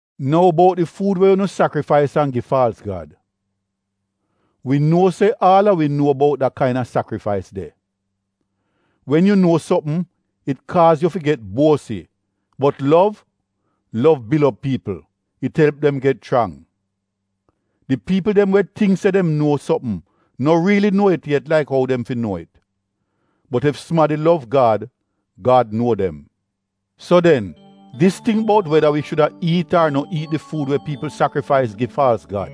Nou bout di fuud we unu sakrifais an gi faalz gad: wi nuo se aal a wi nuo bout da kaina sakrifais de. Wen yu nuo sopm it kaaz yu fi get buosi bot lov, lov bil op piipl — it elp dem get chrang. Di piipl dem we tingk se dem nuo sopm no riili nuo it yet laik ou dem fi nuo it. Bot ef sumadi lov Gad, Gad nuo dem. So den dis ting bout weda wi shuda iit ar no iit di fuud we piipl sakrifais gi faalz gad: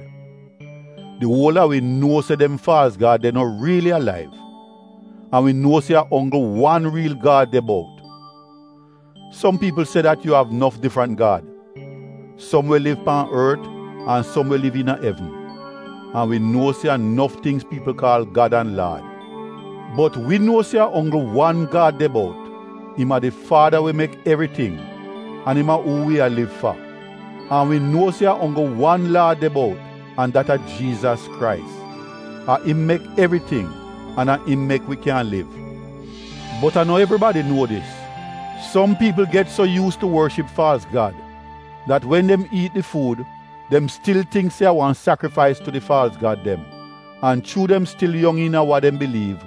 di uol a wi nuo se dem faalz gad de no riili alaiv. An wi nuo se a onggl wan riil Gad de bout. Som piipl se dat yu av nof difrant gad, som we liv pan ort an som we liv iina evn (an wi nuo se a nof tingz piipl kaal gad an laad). Bot wi nuo se a onggl wan Gad de bout. Im a di Faada we mek evriting an im a uu wi a liv fa. An wi nuo se a onggl wan Laad de bout an dat a Jiizas Krais, a im mek evriting an a im mek wi kyan liv. Bot a no evribadi nuo dis. Som piipl get so yuus tu worship faalz gad dat wen dem iit di fuud dem stil tingk se a wan sakrifais tu di faalz gad dem. An chuu dem stil yong iina wa dem biliiv,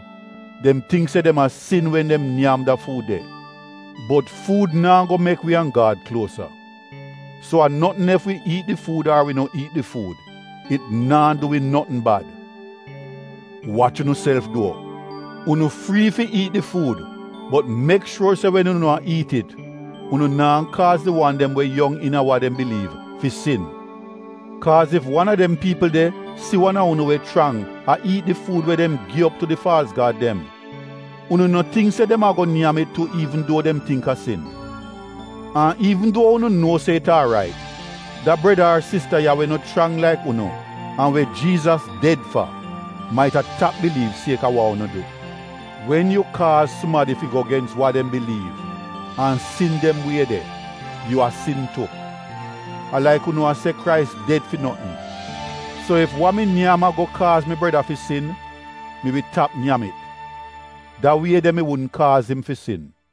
dem tingk se dem a sin wen dem nyam da fuud de. Bot fuud naa go mek wi an Gad kluosa, so a notn ef wi iit di fuud ar wi no iit di fuud. It naa du wi notn bad. Wach unuself duo! Unu frii fi iit di fuud bot mek shuor se wen unu a iit it, unu naa kaaz di wan dem we yong iina wa dem biliiv fi sin. Kaaz ef wan a dem piipl de si wan a unu we chrang a iit di fuud we dem gi op tu di faalz gad dem, unu no tingk se dem ago nyam it tu iivn duo dem tingk a sin? An iivn duo unu nuo se it aarait, da breda ar sista ya we no chrang laik unu an we Jiizas ded fa, maita tap biliiv sieka wa unu du. Wen yu kaaz sumadi fi go gens wa dem biliiv, an sin dem wie de, yu a sin tu. A laik unu a se Krais ded fi notn. So ef wa mi nyam ago kaaz mi breda fi sin, mi wi tap nyam it. Da wie de mi wudn kaaz im fi sin.